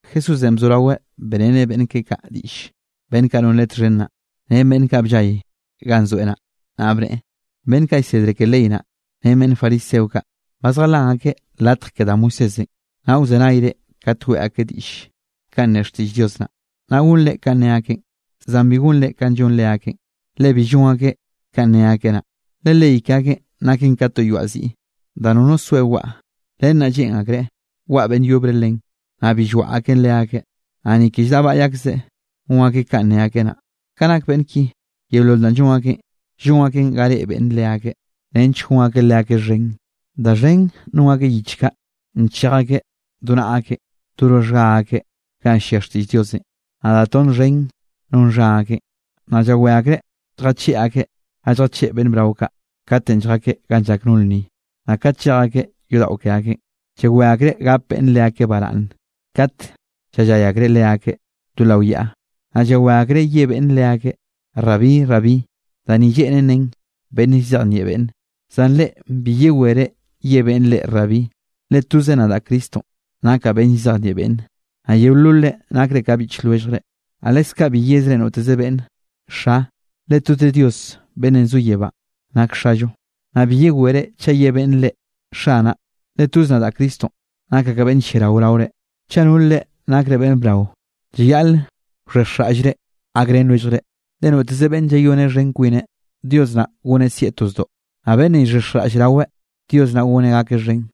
Jesúsenꞌ bzoraweꞌ beꞌreneꞌ beꞌnn keꞌe kaꞌ diꞌll, beꞌnn kaꞌ non Leꞌe txhen naꞌ, ren beꞌnn kaꞌ bllay ganꞌ zoeꞌ naꞌ, naꞌ bneꞌe: —Beꞌnn kaꞌ llsedre ke leyenꞌ naꞌ, ren beꞌnn fariseo kaꞌ, ba zjalan akeꞌ latj ke da Moisésenꞌ. Naꞌ wzenayre kat weꞌe akeꞌ diꞌll, kanꞌ ne xtiꞌll Dios naꞌ, naꞌ gonre kanꞌ ne akeꞌn. Zan bi gonre kanꞌ llon leakeꞌn, le bi llon akeꞌ kanꞌ ne akeꞌ naꞌ. Le ley ke akeꞌn naken ka to yoaꞌ ziꞌ, da nono soe waꞌa, len naꞌ lleꞌn akreꞌ waꞌa beꞌnn yobre len, naꞌ bi llwaꞌa akeꞌn leakeꞌ, naꞌ ni ke lldaꞌbaꞌy akzeꞌ gon akeꞌ kanꞌ ne akeꞌ naꞌ. Ka nak beꞌnn ki yeolol danꞌ llon akeꞌn, llon akeꞌn ga reꞌe beꞌnne leakeꞌ, nench gon akeꞌ leakeꞌ xhen. Da xhen non akeꞌ yich kaꞌ, nchej akeꞌ do naꞌa akeꞌ, do roxhga akeꞌ ganꞌ llia xtiꞌll Diosenꞌ. Naꞌ da tonn xhen non xha akeꞌn. Naꞌ llawé akreꞌ lljacheꞌ akeꞌ ga lljacheꞌ beꞌnn brao kaꞌ, katenꞌ lljakeꞌ ga llak no lnni, naꞌ kat llej akeꞌ yodaꞌo ke akeꞌn. Llawé akreꞌ gap beꞌnne leakeꞌ baraꞌnne kate llallay akreꞌ leakeꞌ do lao yaꞌa. Naꞌ llawé akreꞌ ye beꞌnne leakeꞌ: “Rabí, Rabí” (da ni lleꞌnen nen beꞌnn llzejnieꞌ beꞌnne). ’Zan reꞌ bi yewere ye beꞌnne reꞌ Rabí, le toze nadaꞌ Cristonꞌ nakaꞌ beꞌnn llzejnieꞌ beꞌnne. Naꞌ yeololre nakre ka biꞌch lwelljre. Naꞌ leskaꞌ bi yezreꞌ noteze beꞌnne: “Xa”, le toze Dios beꞌnnenꞌ zo yebánꞌ nak Xallo. Naꞌ bi yewere chaꞌ ye beꞌnne reꞌ: “Xanaꞌ”, le toz nadaꞌ Cristonꞌ nakaꞌ ka beꞌnn lliarao raore. Chaꞌ nol reꞌ nakre beꞌnn brao, llayaꞌl wxhexjraꞌllre gakrén lwelljre. Le noteze beꞌnne llayoneꞌ xhen kwineꞌ, Dios naꞌ goneꞌ sieꞌ to zdoꞌ, naꞌ beꞌnne llxhexjraꞌll raweꞌ, Dios naꞌ goneꞌ gakeꞌ xhen.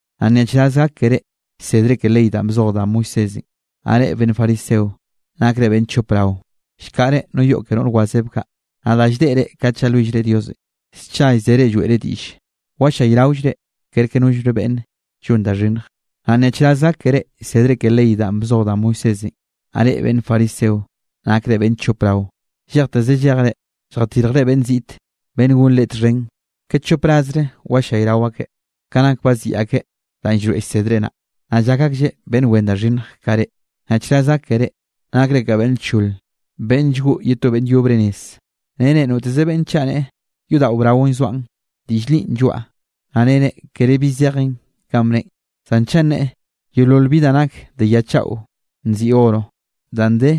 ’Naꞌ ¡nyaꞌchraz gak keré llsedre ke ley danꞌ bzoj da Moisésenꞌ, naꞌ reꞌ beꞌnn fariseo! ¡Nakre beꞌnn chop rao! Llkaꞌre no yoꞌ ke noꞌr wazeb kaꞌ, naꞌ da lldeꞌre kat llalwillre Diosenꞌ, scha llzere lloeꞌre diꞌll. Wallayraollre kerke nollre beꞌnn llon da xhinnj. ’Naꞌ ¡nyaꞌchraz gak keré llsedre ke ley danꞌ bzoj da Moisésenꞌ, naꞌ reꞌ beꞌnn fariseo! ¡Nakre beꞌnn chop rao! Llejteze llejre, lljatirjre beꞌnn ziꞌte, beꞌnn gonrén reꞌ txhen; ke chop rasre wallayrao akeꞌ, ka nak baziꞌi akeꞌ danꞌ llroeꞌ llsédere naꞌ, naꞌ llak aklleꞌ beꞌnn wen da xhinnj ka reꞌ. ’¡Nyaꞌchraz gak keré! ¡Nakre ka beꞌnn lchol, beꞌnn llgoꞌ ye to beꞌnn yobre nez! Nere noteze beꞌnne chaꞌ neꞌe: “Yodaꞌo braonꞌ llzoaꞌn, diꞌll linꞌ lloaꞌa”, naꞌ nere kere bi zejen kanꞌ bneꞌen. Zan chaꞌ neꞌe: “Yeolol bi da nak de ya chaꞌo nziꞌi oro danꞌ de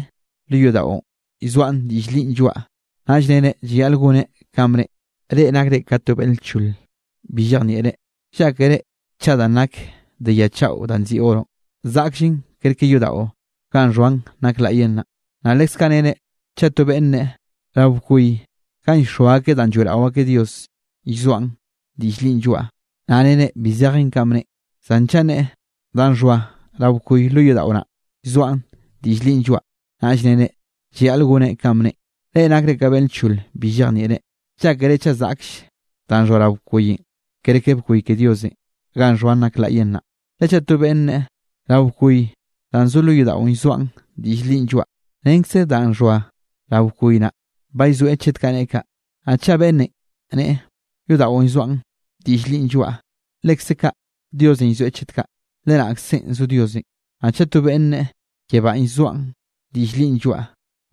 lo yodaꞌon llzoaꞌn, diꞌll linꞌ lloaꞌa”, naꞌll nere llayaꞌl goneꞌ kanꞌ bneꞌen. ¡Reꞌ nakreꞌ ka to beꞌnn lchol bi llejnieꞌre! ¿Llákere chaꞌ danꞌ nak de ya chaꞌo danꞌ nziꞌi oro, zaꞌkllen kerke yodaꞌo ganꞌ xhoan nak laꞌyenꞌ naꞌ? Naꞌ leskaꞌ nere chaꞌ to beꞌnn neꞌe: “Rao bkoy ganꞌ llxoa akeꞌ danꞌ lloeꞌrao akeꞌ Dios llzoaꞌn, diꞌll linꞌ lloaꞌa”, naꞌ nere bi zejen kanꞌ bneꞌen. Zan chaꞌ neꞌe: “Danꞌ xhoa rao bkoy lo yodaꞌo naꞌ, llzoaꞌn, diꞌll linꞌ lloaꞌa”, naꞌllenꞌ nere llayaꞌl goneꞌ kanꞌ bneꞌen. ¡Reꞌ nakre ka beꞌnn lchole bi llejnieꞌre! ¿Llákere chaꞌ zaꞌkll danꞌ xhoa rao bkoyenꞌ, kerke bkoy ke Diosenꞌ ganꞌ xhoan nak laꞌyenꞌ naꞌ? Le chaꞌ to beꞌnne neꞌe: “Rao bkoy danꞌ zo lo yodaꞌon llzoaꞌn, diꞌll linꞌ lloaꞌa”, renkze danꞌ xhoa rao bkoy naꞌ, ba llzoeꞌ chet kaꞌ neꞌe kaꞌ. Naꞌ chaꞌ beꞌnne neꞌe: “Yodaꞌon llzoaꞌn, diꞌll linꞌ lloaꞌa”, lekze kaꞌ Diosenꞌ llzoeꞌ chet kaꞌ, le naꞌkzenꞌ zo Diosenꞌ. Naꞌ chaꞌ to beꞌnn neꞌe: “Yebánꞌ llzoaꞌn, diꞌll linꞌ lloaꞌa”,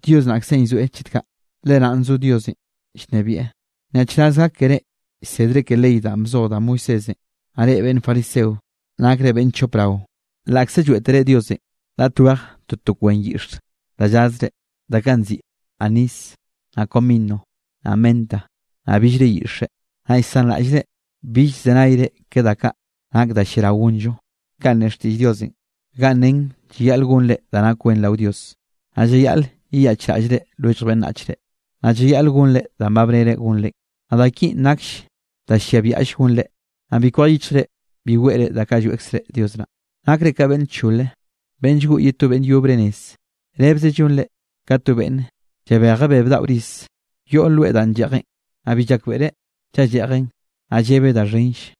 Dios naꞌkzenꞌ llzoeꞌ chet kaꞌ, le naꞌn zo Diosenꞌ llnebieꞌ. ’¡Nyaꞌchraz gak keré llsedre ke ley danꞌ bzoj da Moisésenꞌ, naꞌ reꞌ beꞌnn fariseo! ¡Nakre beꞌnn chop rao! Laꞌkze lloeꞌtere Diosenꞌ raꞌt wej toto kwen yiꞌx da llazre, da kaꞌ nziꞌi anis, naꞌ comino, naꞌ menta, naꞌ billre yiꞌxe, naꞌ llsanraꞌllre, bill llzenayre ke da kaꞌ nak da lliaraoll gonllo, kanꞌ ne xtiꞌll Diosenꞌ ganꞌ nen llayaꞌl gonre da nak wen rao Dios, naꞌ llayaꞌl yeyaꞌchraꞌllre lwellj beꞌnnachre, naꞌ llayaꞌl gonre danꞌ ba bnere gonre. Naꞌ da kinꞌ nakll da llia biaꞌll gonre, naꞌ bi kwej yichjre bi weꞌre da kaꞌ lloeꞌkzre Dios naꞌ. ¡Nakre ka beꞌnn lchol, beꞌnn llgoꞌ ye to beꞌnn yobre nez! Rebze llonre ka to beꞌnne llabej bebe daꞌo riz yoꞌ loe danꞌ lleꞌjeꞌn, naꞌ bi llakbeꞌreꞌ chaꞌ lleꞌjeꞌn, naꞌ llebeꞌ da xhenll.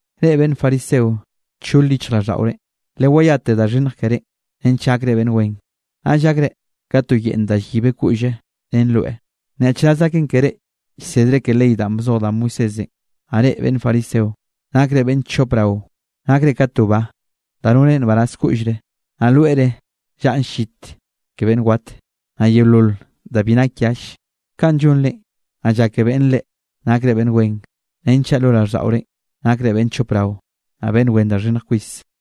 ¡Reꞌ beꞌnn fariseo, nchol yichjraꞌlldaꞌore! Leyeyate da xhinnj kerénꞌ, nench gakre beꞌnn wen. Naꞌll gakre ka to yeꞌnn danꞌ yibe koꞌlle ren loe. ’¡Nyaꞌchraz naken keré llsedre ke ley danꞌ bzoj da Moisésenꞌ, naꞌ reꞌ beꞌnn fariseo! ¡Nakre beꞌnn chop rao! Nakre ka to ba, da noneꞌ nbaraz koꞌllre, naꞌ loere llaꞌn llit ke beꞌnn wat, naꞌ yeolol da bi nak yall. Kaꞌn llonrenꞌ, naꞌ llake beꞌnn reꞌ, nakre beꞌnn wen, renchaꞌ lo raꞌlldaꞌorenꞌ nakre beꞌnn chop rao, naꞌ beꞌnn wen da xhinnj kwis.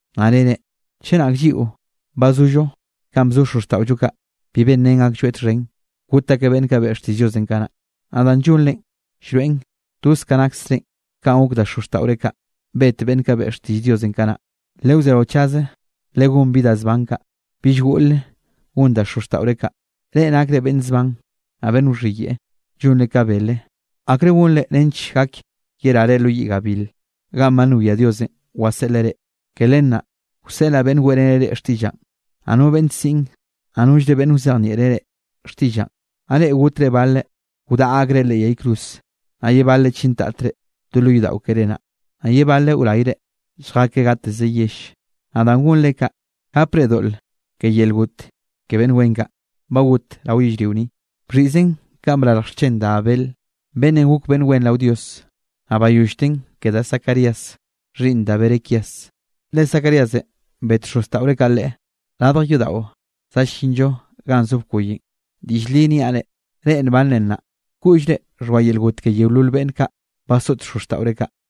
Naꞌ nere: “Chenak lliꞌo ba zollo kanꞌ bzo xozxtaꞌollo kaꞌ, bi benrén aklloeꞌ txhen, got akeꞌ beꞌnn kaꞌ beꞌe xtiꞌll Diosenꞌ kanaꞌ.” Naꞌ danꞌ llonrenꞌ llroeꞌn toz ka naksrenꞌ kanꞌ gok da xozxtaꞌore kaꞌ, bet beꞌnn kaꞌ beꞌe xtiꞌll Diosenꞌ kanaꞌ. ¡Lewzeraochaze legón bi ka da zban kaꞌ, bill goꞌle gon da xozxtaꞌore kaꞌ! ’¡Reꞌ nakre beꞌnn zban, naꞌ beꞌnn wxhiyeꞌe, llonre ka bele! ¿Akre gonre nench gak yerare lo yiꞌ gabil, ganꞌ ba nwia Diosenꞌ waseꞌleꞌ reꞌ? Ke len naꞌ, wseꞌlaꞌ beꞌnn weꞌreneꞌ reꞌ xtiꞌllaꞌn, naꞌ no beꞌnn siꞌn, naꞌ nollre beꞌnn wzejnieꞌre reꞌ xtiꞌllaꞌn. Naꞌ reꞌ gotre baleꞌ, wdaꞌa akreꞌ leꞌ yay cruz, naꞌ ye baleꞌ chintatre do lo yodaꞌo keré naꞌ, naꞌ ye baleꞌ wrayre, lljakeꞌ gateze yell. Naꞌ danꞌ gonre kaꞌ, gapre doꞌl ke yel got ke beꞌnn wen kaꞌ, ba got rao yellrio ni, bxhiꞌzen kanꞌ brarj xchen da Abel, beꞌnnenꞌ gok beꞌnn wen rao Dios, naꞌ bayollten ke da Zacarías xhiꞌnn da Berequías. Le Zacaríasenꞌ bet xozxtaꞌore kaꞌ leꞌe radj yodaꞌo za llinl-llo ganꞌ zo bkoyenꞌ. Diꞌll li niaꞌ reꞌ, reꞌ nbanre nnaꞌ, koꞌllre xhoa yel got ke yeolol beꞌnn kaꞌ basoꞌt xozxtaꞌore kaꞌ.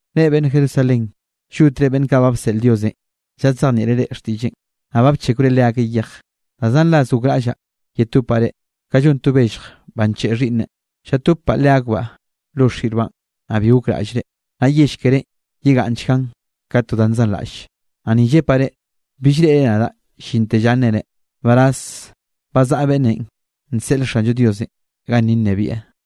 ’Reꞌ beꞌnn Jerusalén, llotre beꞌnn kaꞌ ba bseꞌl Diosenꞌ lladzejnieꞌre reꞌ xtiꞌlleꞌn, naꞌ ba bchekwre leakeꞌ yej. Da zan ras gokraꞌllaꞌ yetopaꞌ reꞌ, ka llon to bellj ba ncheꞌe xhiꞌnne, llatobbaꞌ leakbaꞌ lo xirbaꞌn, naꞌ bi gokraꞌllre. Naꞌ yell kerénꞌ yegaꞌnnchgan ka to danꞌ nzanraꞌll. Naꞌ ni llepaꞌ reꞌ, bill reꞌre nadaꞌ llinte lla nnereꞌ: “Nbaraz ba zaꞌa beꞌnnenꞌ nseꞌl Xanllo Diosenꞌ ganni nnebieꞌ.”